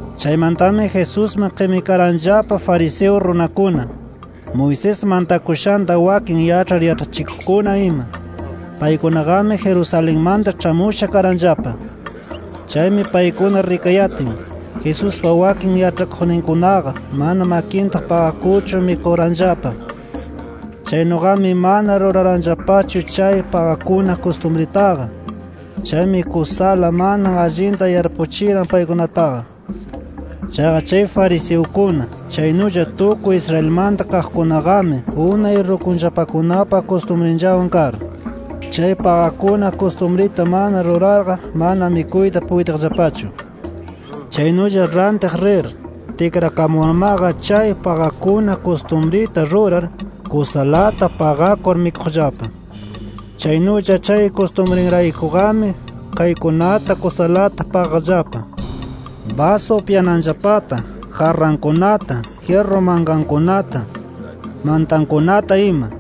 Chaymantami Jesusman qimikaranllapa fariseo runakuna, Moisés mantakushanta wakin yaĉhar yaĉhachikuqkuna ima. Paykunaqami Jerusalenmanta ĉhamusha karanllapa. Chaymi paykuna rikayatin, Jesuspa wakin yaĉhakuqninkunaqa mana makinta paqakurchu mikuranllapa. Chaynuqami mana ruraranllapachu chay paqakuna kustumritaqa. Chaymi kusala mana allinta yarpuchiran paykunataqa. Chaqa chay fariseukuna, chaynulla tukuy Israelmanta kaqkunaqami unay rukunllapakunapa kustumrinllawan kar, chay paqakuna kustumrita mana rurarqa mana mikuyta puytiqllapachu. Chaynulla rantiq rir, tikrakamurmaqa chay paqakuna kustumrita rurar, kusalata paqakur mikuqllapa. Chaynulla chay kustumrinraykuqami kaykunata kusalata paqaqllapa: Basu upyananllapata; jarrankunata, jyirru mankankunata, mantankunata ima.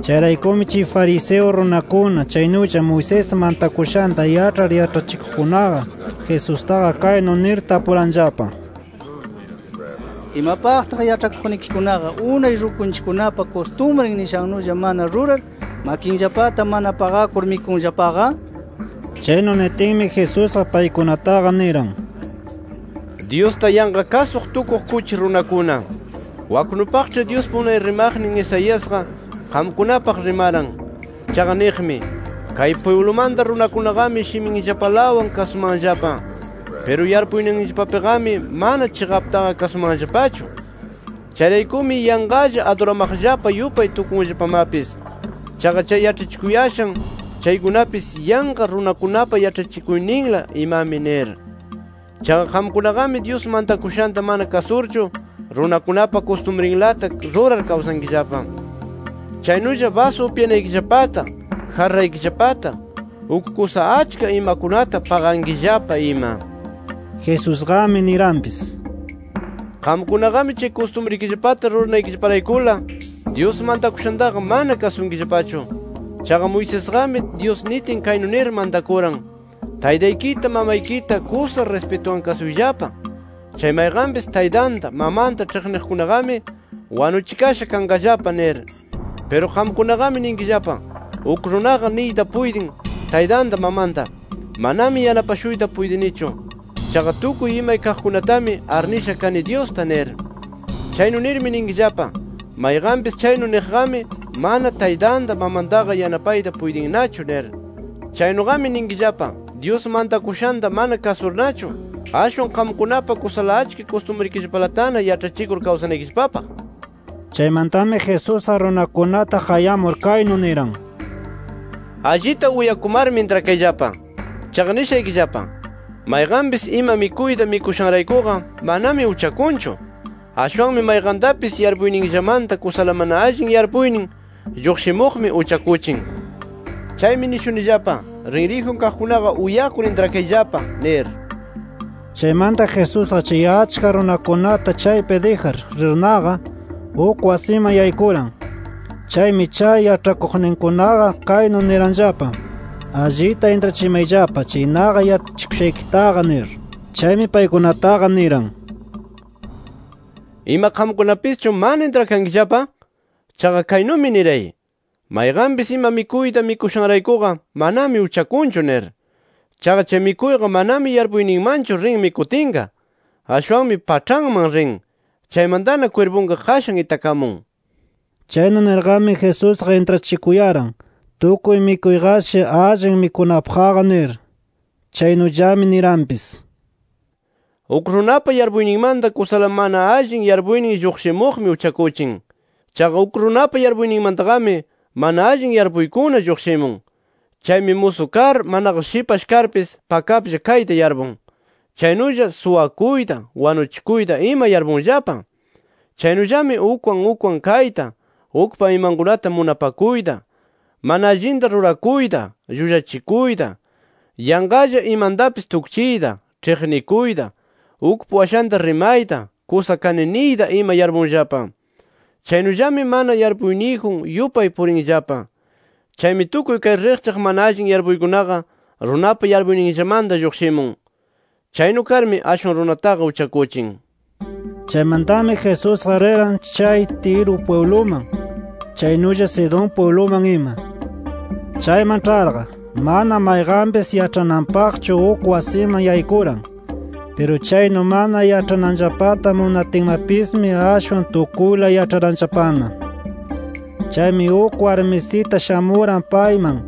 Chayraykumi chay fariseo runakuna chaynulla Moisés mantakushanta yaĉhar yaĉhachikuqkunaqa, Jesustaqa kaynu nir tapuranllapa: —¿Imapaqtaq yaĉhakuqnikikunaqa unay rukunchikkunapa kustumrin nishannulla mana rurar, makinllapata mana paqakur mikunllapaqa? nir. Chaynu nitinmi Jesusqa paykunataqa niran: —¡Dyusta yanqa kasuq tukuq kuchi runakuna! Waknupaqĉhi Dyuspa unay rimaqnin Isaiasqa, qamkunapaq rimaran. Chaqa niqmi: Kay pwiblumanta runakunaqami shiminllapalawan kasumanllapa. Piru yarpuyninllapapiqami mana chiqaptaqa kasumanllapachu. Chayraykumi yanqalla aduramaqllapa yupay tukunllapamapis. Chaqa chay yaĉhachikuyashan chaykunapis yanqa runakunapa yaĉhachikuyninla imami nir. Chaqa qamkunaqami Dyus mantakushanta mana kasurchu, runakunapa kustumrinlata rurar kawsankillapa. [Chaynulla basu upyanaykillapata, jarraykillapata, uk kusa achka imakunata paqankillapa ima.] Jesusqami niranpis: “Qamkunaqami chay kustumrikillapata ruranaykillaparaykula, Dyus mantakushantaqa mana kasunkillapachu. Chaqa Moisesqami Dyus nitin kaynu nir mantakuran: ‘Taytaykita mamaykita kusa rispituwan kasuyllapa. Chay mayqanpis taytanta mamanta ĉhiqniqkunaqami wanuchikasha kanqallapa’ nir. Piru qamkunaqami ninkillapa, uk runaqa niyta puytin taytanta mamanta: ‘Manami yanapashuyta puytinichu. Chaqa tukuy imay kaqkunatami arnisha kani Dyusta’ nir. Chaynu nirmi ninkillapa: ‘Mayqanpis chaynu niqqami manana taytanta, mamantaqa yanapayta puytinnachu’ nir. Chaynuqami ninkillapa, Dyus mantakushanta mana kasurnachu, ashwan qamkunapa kusala achka kustumrikillapalatana yaĉhachikur kawsanaykillapapaq”. Chaymantami Jesusqa runakunata qayamur kaynu niran: “Allita uyakumarmi, intrakayllapa. Chaqa nishaykillapa: Mayqanpis ima mikuyta mikushanraykuqa manami uchakunchu. Ashwanmi mayqantapis yarpuyninllamanta kusala mana allin yarpuynin lluqshimuq uchakuchin. [ Chaymi nishunillapa: Rinriyjun kaqkunaqa uyakur intrakayllapa nir]”. Chaymanta Jesusqa chay achka runakunata chaypi dijar rirnaqa, uk wasiman yaykuran. Chaymi chay yaĉhakuqninkunaqa kaynu niranllapa: “Allita intrachimayllapa, chay naqa yaĉhachikushaykitaqa” nir. Chaymi paykunataqa niran: “¿Ima qamkunapischu mana intrakankillapa? Chaqa kaynumi niray: Mayqanpis ima mikuyta mikushanraykuqa manami uchakunchu nir. Chaqa chay mikuyqa manami yarpuyninmanchu rin mikutinqa. Ashwanmi paĉhanman rin, chaymantana kwirpunqa qashan itakamun”. Chaynu nirqami Jesusqa intrachikuyaran tukuy mikuyqashi allin mikunapaqqa nir. Chaynullami niranpis: “Uk runapa yarpuyninmanta kusala mana allin yarpuynin lluqshimuqmi uchakuchin. Chaqa uk runapa yarpuyninmantaqami mana allin yarpuykuna lluqshimun. Chaymi musu kar, manaqa shipash karpis pakaplla kayta yarpun. Chaynulla suwakuyta, wanuchikuyta ima yarpunllapa. Chaynullami ukwan ukwan kayta, ukpa imankunata munapakuyta, mana allinta rurakuyta, llullachikuyta, yanqalla imantapis tukchiyta, ĉhiqnikuyta, ukpa washanta rimayta, kusa kani niyta ima yarpunllapa. Chaynullami mana yarpuyniyjun yupay purinllapa. Chaymi tukuy kay riqchaq mana allin yarpuykunaqa runapa yarpuyninllamanta lluqshimun. Chaynu karmi, ashwan runataqa uchakuchin”. Chaymantami Jesusqa riran chay Tiro pwibluman [chaynulla Sidón pwibluman ima]. Chayman ĉharqa, mana mayqanpis yaĉhananpaqchu uk wasiman yaykuran. Piru chaynu mana yaĉhananllapata munatinmapismi ashwan tukuyla yaĉharanllapana. Chaymi uk warmisita shamuran payman.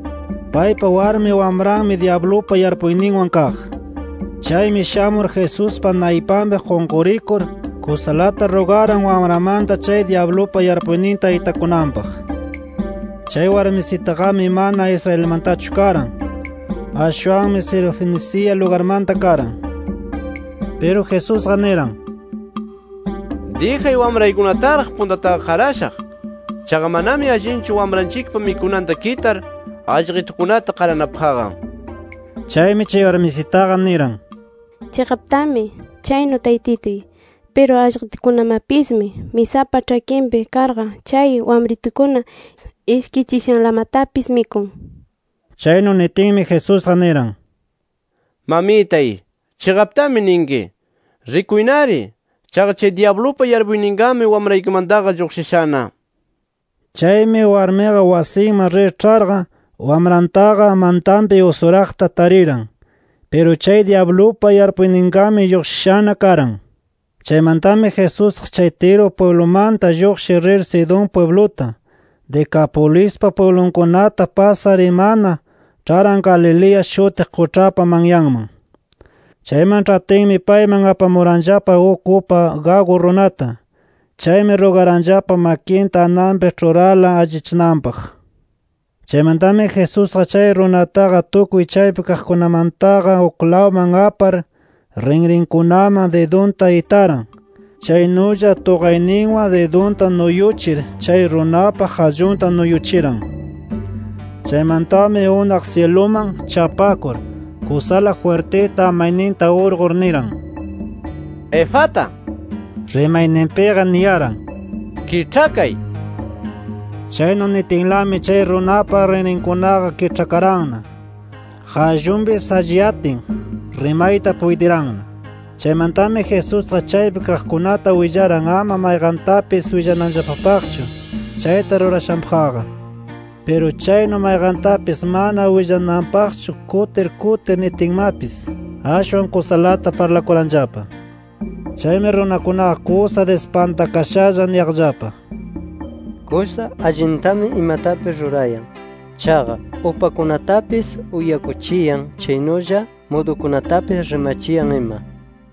Paypa warmi wamranmi dyablupa yarpuyninwan kaq. Chaymi shamur Jesuspa naypanpi qunqurikur, kusalata rugaran wamranmanta chay dyablupa yarpuyninta itakunanpaq. Chay warmisitaqami mana Israelmantachu karan. Ashwanmi Sirofenicia lugarmanta karan. Piru Jesusqa niran: —Dijay wamraykunataraq puntataqa qarashaq. Chaqa manami allinchu wamranchikpa mikunanta kitar allqitukunata qaranapaqqa nir. Chaymi chay warmisitaqa niran: —Chiqaptami chaynu Taytituy. Piru allqitukunamapismi, misapa ĉhakinpi karqa chay wamritukuna ishkichishanlamatapis mikun nir. Chaynu nitinmi Jesusqa niran: —¡Mamitay, chiqaptami ninki! Rikuynari. Chaqa chay dyablupa yarpuyninqami wamraykimantaqa lluqshishana nir. Chaymi warmiqa wasinman rir ĉharqa, wamrantaqa mantanpi usuraqta tariran. Piru chay dyablupa yarpuyninqami lluqshishana karan. Chaymantami Jesusqa chay Tiro pwiblumanta lluqshir rir Sidón pwibluta, Decapolispa pwiblitunkunata pasar imana, ĉharan Galilea shutiq quĉhapa manyanman. Chayman ĉhatinmi payman apamuranllapa uk upa gagu runata. Chaymi rugaranllapa makinta ananpi ĉhurarla allichananpaq. Chaymantami Jesusqa chay runataqa tukuy chaypi kaqkunamantaqa uklawman apar, rinrinkunaman didunta itaran. Chaynulla tuqayninwan didunta nuyuchir chay runapa qallunta nuyuchiran. Chaymantami unaq syiluman chapakur, kusala jwirtita amayninta urqur, niran: “¡Efata!” (Rimayninpiqa niyaran: “¡Kiĉhakay!” nir). Chaynu nitinlami chay runapa rinrinkunaqa kiĉhakaranna. Qallunpis alliyatin, rimayta puytiranna. Chaymantami Jesusqa chaypi kaqkunata willaran ama mayqantapis willananllapapaqchu chayta rurashanpaqqa. Piru chaynu mayqantapis mana willananpaqchu kutir kutir nitinmapis, ashwan kusalata parlakuranllapa. Chaymi runakunaqa kusa dispantakashalla niyaqllapa: “Kusa allintami imatapis rurayan. ¡Chaqa upakunatapis uyakuchiyan! Chaynulla mudukunatapis rimachiyan ima” nir.